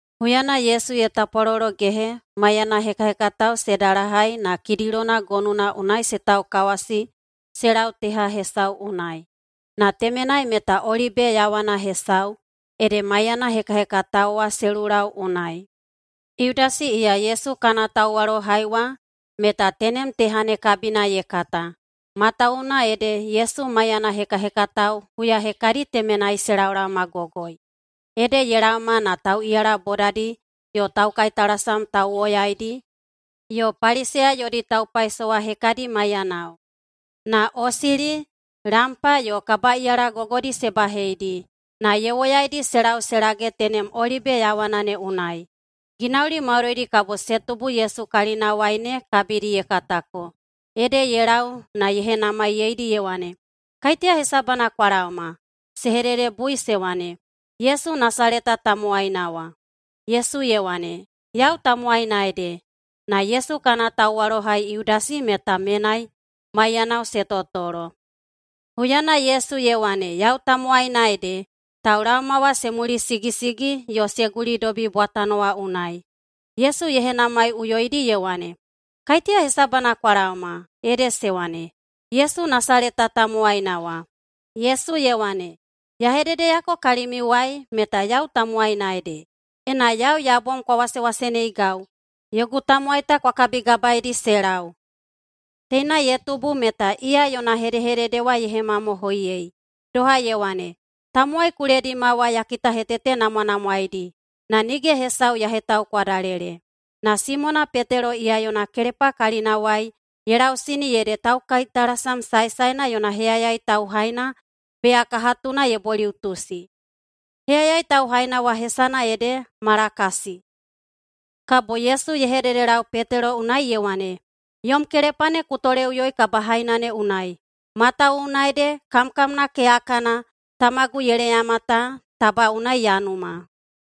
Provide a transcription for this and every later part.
Huyana Yesu ye tapwalologehe maiyana hekahekatao se dalahai na Kidilona gonuna unai se taukawasi se lau teha hesau unai. Na temenai meta olibe yaowana hesau, ede maiyana hekahekatao wa se lulau unai. Yudasi iya Yesu kana tauwalohai wa meta tenem teha ne kabina ye kata, matawuwuna ede Yesu maiyana hekahekatao huya hekadi temenai se laolaomagogoi. Ede ye laoma na tauꞌiyala bodadi yo taukaitalasam tauwoyaidi yo Paliseya yodi taupaisowa hekadi maiyanao. Na osili, lampa yo kabaꞌiyala gogodi se baheidi, na ye woyaidi se lau se lage tenem olibe yaowana ne unai. Ginauli maudoidi kabo se tubu Yesu kalinawai ne kabidi ye katako, ede ye lau na ye henamaiyeidi ye wane, “Kaiteya hesabana kwa laoma?” Se hededebui se wane, “Yesu Nasaleta tamowaina wa.” Yesu ye wane, “Yau tamowaina ede.” Na Yesu kana tauwalohai Yudasi meta menai maiyanao se totolo. Huyana Yesu ye wane, “Yau tamowaina ede,” taulaoma wa se mulisigisigi yo se gulidobi bwatano wa unai. Yesu ye henamaiꞌuyoidi ye wane, “Kaiteya hesabana kwa laoma?” Ede se wane, “Yesu Nasaleta tamowaina wa.” Yesu ye wane, “Ya hededeyako kalimiuwai meta yau tamowaina ede. Ena yau ya bom kwa wasewaseneigau, yogu tamowai ta kwa kabigabaeidi se lau.” Teina ye tubu meta iya yona hedehedede wa ye hemamohoiyei, doha ye wane, “Tamowai ku ledima wa ya kitahetetenamwanamwaedi na nige hesau ya hetaukwadalele.” Na Simona Petelo iya yona kelepa kalinawai ye lausini ede taukaitalasam saesaena yona heyayai tauhaina beyakahatuna ye boliꞌutusi. Heyayai tauhaina wa hesana ede Malakasi. Kabo Yesu ye hededelau Petelo unai ye wane, “Yom kelepa ne ku toleꞌuyoi kabahaina ne unai! Matawuwuna ede kamkamna keyakana Tamagu ye leyama ta, taba unai ya numa.”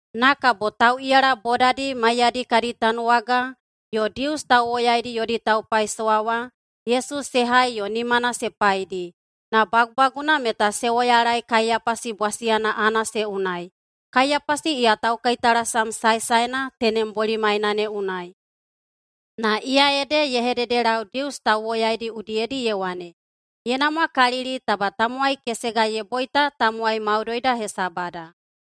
Na kabo tauꞌiyala bodadi maiyadi kadi tanuwaga yo Dius tauwoyaidi yodi taupaisowa wa Yesu se hai yo nimana se paidi. Na bagubaguna meta se woyalaei Kaiyapasi bwasiyana Anase unai. Kaiyapasi iya taukaitalasam saesaena tenem bolimaina ne unai. Na iya ede ye hededelau Dius tauwoyaidi udiyedi ye wane, “Ye namwakalili taba tamowai kesega ye boita tamowai maudoida hesabada.”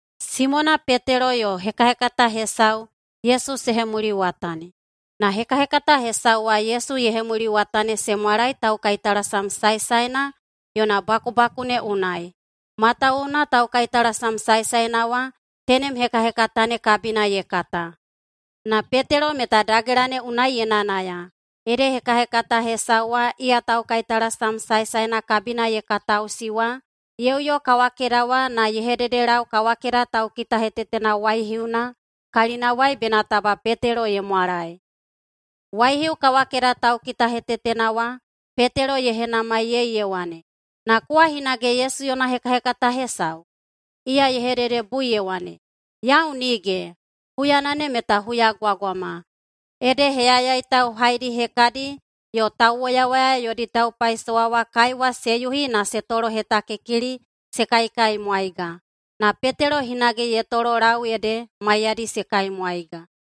Simona Petelo yo hekahekata hesau Yesu se hemuliwatani. Na hekahekata hesau wa Yesu ye hemuliwatani se mwalae taukaitalasam saesaena yona bakubaku ne unai, matawuwuna taukaitalasam saesaena wa tenem hekahekata ne kabina ye kata. Na Petelo meta dagela ne unai ye nayanaya, ede hekahekata hesau wa iya taukaitalasam saesaena kabina ye kataꞌusi wa ye uyo kawakeda wa na ye hededelau kawakeda taukitahetetena waihiuna kalinawai bena taba Petelo ye mwalae. Waihiu kawakeda taukitahetetena wa Petelo ye henamaiyei ye wane, “Na kowa hinage Yesu yona hekahekata hesau?” Iya ye hededebui ye wane, “Yau nige.” Huyana ne meta huyagwagwama, ede heyayai tauhaidi hekadi yo tauwoyawoya yodi taupaisowa wa kaiwa se yuhi na se tolohetakikili se kaikaimwaiga. Na Petelo hinage ye tololau ede maiyadi se kaimwaiga.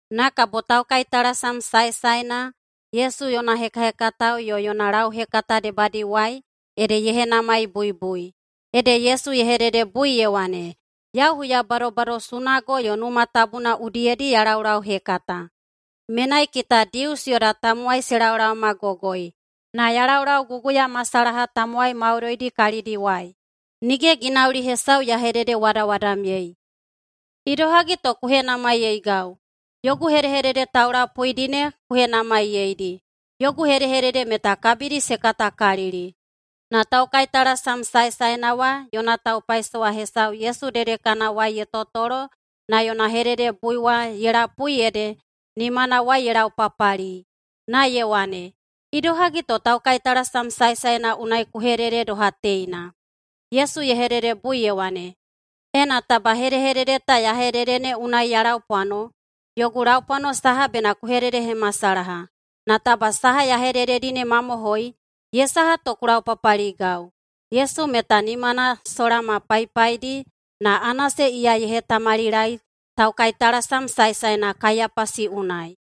Na kabo taukaitalasam saesaena Yesu yona hekahekatao yo yona lauhekata debadiwai ede ye henamaibuibui. Ede Yesu ye hededebui ye wane, “Yau huya badobado sunago yo Numa Tabuna udiyedi ya laulauhekata. Menai kita Dius yoda tamowai se laolaomagogoi, na ya laulauguguyamasalaha tamowai maudoidi kalidiwai. Nige ginauli hesau ya hededewadawadamyei. Idohagi to ku henamaiyeigau? Yogu hedehedede taulapuidi ne ku henamaiyeidi. Yogu hedehedede meta kabidi se katakalili.” Na taukaitalasam saesaena wa yona taupaisowa hesau Yesu dedekanawai ye totolo na yona hededebui wa ye lapui ede nimanawai ye laupapali, na ye wane, “Idohagi to taukaitalasam saesaena unai ku hedede doha teina?” Yesu ye hededebui ye wane, “Ena taba hedehedede ta ya hedede ne unai ya laupwano, yogu laupwano saha bena ku hededehemasalaha. Na taba saha ya hedededi ne mamohoi, ye saha to ku laupapaligau?” Yesu meta nimana sola ma paipaidi, na Anase iya ye hetamalilae taukaitalasam saesaena Kaiyapasi unai.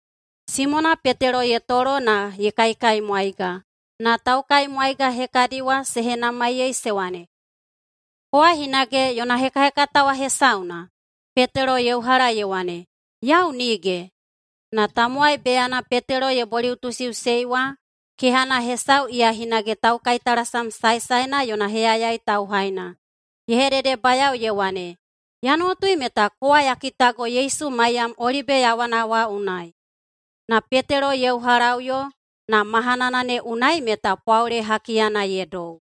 Simona Petelo ye tolo na ye kaikaimwaiga, na taukaimwaiga hekadi wa se henamaiyei se wane, “Kowa hinage yona hekahekatao wa hesauna?” Petelo ye uhala ye wane, “Yau nige.” Na tamowai beyana Petelo ye boliꞌutusiꞌusei wa kehana hesau iya hinage taukaitalasam saesaena yona heyayai tauhaina, ye hededebayao ye wane, “Ya nuwatui meta kowa ya kitago Yesu maiyam olibe yaowana wa unai.” Na Petelo ye uhalaꞌuyo, na mahanana ne unai meta pwaole hakiyana ye dou.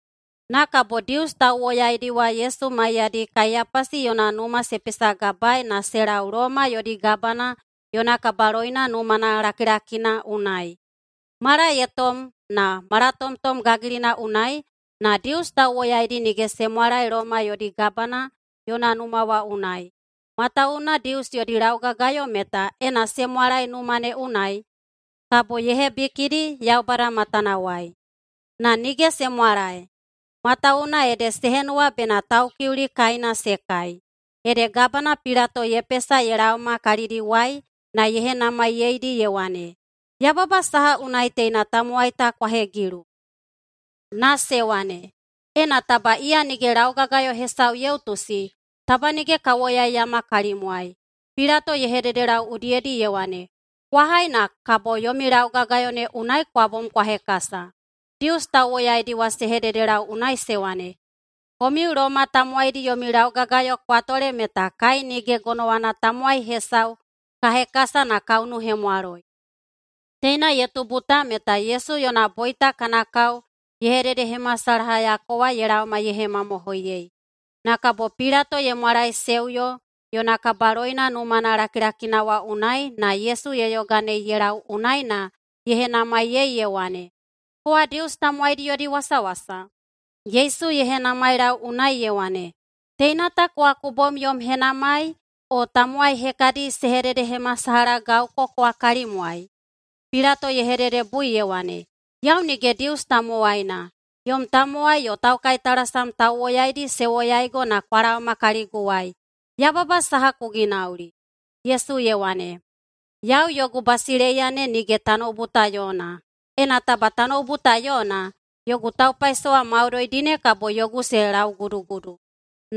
Na kabo Dius tauwoyaidi wa Yesu maiyadi Kaiyapasi yona numa se pesagabaei na se lau Loma yodi gabana yona kabaloina numana lakilakina unai. Mala ye tom na malatomtom gagilina unai, na Dius tauwoyaidi nige se mwalae Loma yodi gabana yona numa wa unai, matawuwuna Dius yodi laugagayo meta ena se mwalae numa ne unai kabo ye hebikidi Yaubada matanawai. Na nige se mwalae, matawuwuna ede se henuwa bena Taukiuli kaina se kai. Ede Gabana Pilato ye pesa ye laoma kalidiwai na ye henamaiyeidi ye wane, “Yababa saha unai teina tamowai ta kwa hegilu?” Na se wane, “Ena taba iya nige laugagayo hesau ye utusi, taba nige ka woyaiyama kalimwai.” Pilato ye hededelau udiyedi ye wane, “Kwa hai na kabo yomi laugagayo ne unai kwa bom kwa hekasa.” Dius tauwoyaidi wa se hededelau unai se wane, “[Komiu Loma tamowaidi yomi laugagayo kwa tole meta] kai nige gonowana tamowai hesau ka hekasa na ka unuhemwaloi.” Teina ye tubu ta meta Yesu yona boita kana kao ye hededehemasalahayako wa ye laoma ye hemamohoiyei. Na kabo Pilato ye mwalaeseuyo yona kabaloina numana lakilakina wa unai na Yesu ye yoganei ye lau unai na ye henamaiyei ye wane, “Kowa Dius tamowaidi yodi wasawasa?” Yesu ye henamailau unai ye wane, “Teina ta kowa ku bom yom henamai, o tamowai hekadi se hededehemasalahagauko kowa kalimwai?” Pilato ye hededebui ye wane, “Yau nige Dius tamowaina. Yom tamowai yo taukaitalasam tauwoyaidi se woyaigo na kwa laoma kaliguwai. Yababa saha ku ginauli?” Yesu ye wane, “Yau yogu basileiya ne nige tanoubu ta yona. Ena taba tanoubu ta yona, yogu taupaisowa maudoidi ne kabo yogu se laugudugudu,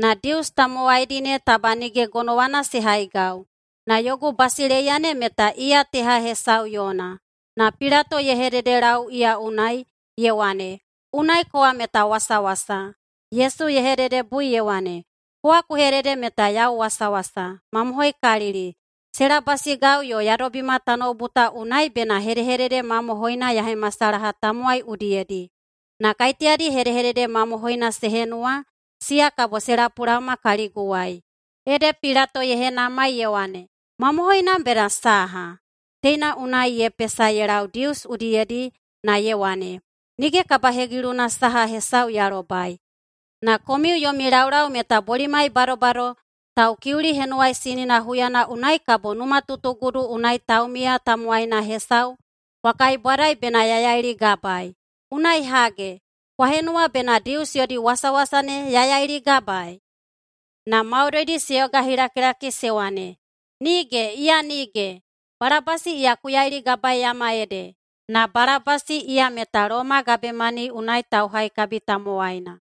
na Dius tamowaidi ne taba nige gonowana se haigau. Na yogu basileiya ne meta iya teha hesau yona.” Na Pilato ye hededelau iya unai, ye wane, “Unai kowa meta wasawasa!” Yesu ye hededebui ye wane, “Kowa ku hedede meta yau wasawasa. Mamohoikalili, se labasigau yo ya dobima tanoubu ta unai bena hedehedede mamohoina ya hemasalaha tamowai udiyedi. Na kaiteyadi hedehedede mamohoina se henuwa, siya kabo se lapulaoma kaliguwai.” Ede Pilato ye henamai ye wane, “Mamohoina bena saha?” Teina unai ye pesa ye lau Dius udiyedi na ye wane, “Nige kabahegiluna saha hesau ya lobai. Na komiu yomi laulau meta bolimai badobado Taukiuli Henuwaisinina huyana unai kabo numatutugudu unai taumiya tamowaina hesau kwa kaibwadai bena ya yailigabaei. Unai hage, kwa henuwa bena Dius yodi wasawasa ne ya yailigabaei?” Na maudoidi se yogahilakilaki se wane, “Nige, iya nige! Balabasi iya ku yailigabaeiyama ede.” Na Balabasi iya meta Loma gabemani unai tauhaikabi tamowaina.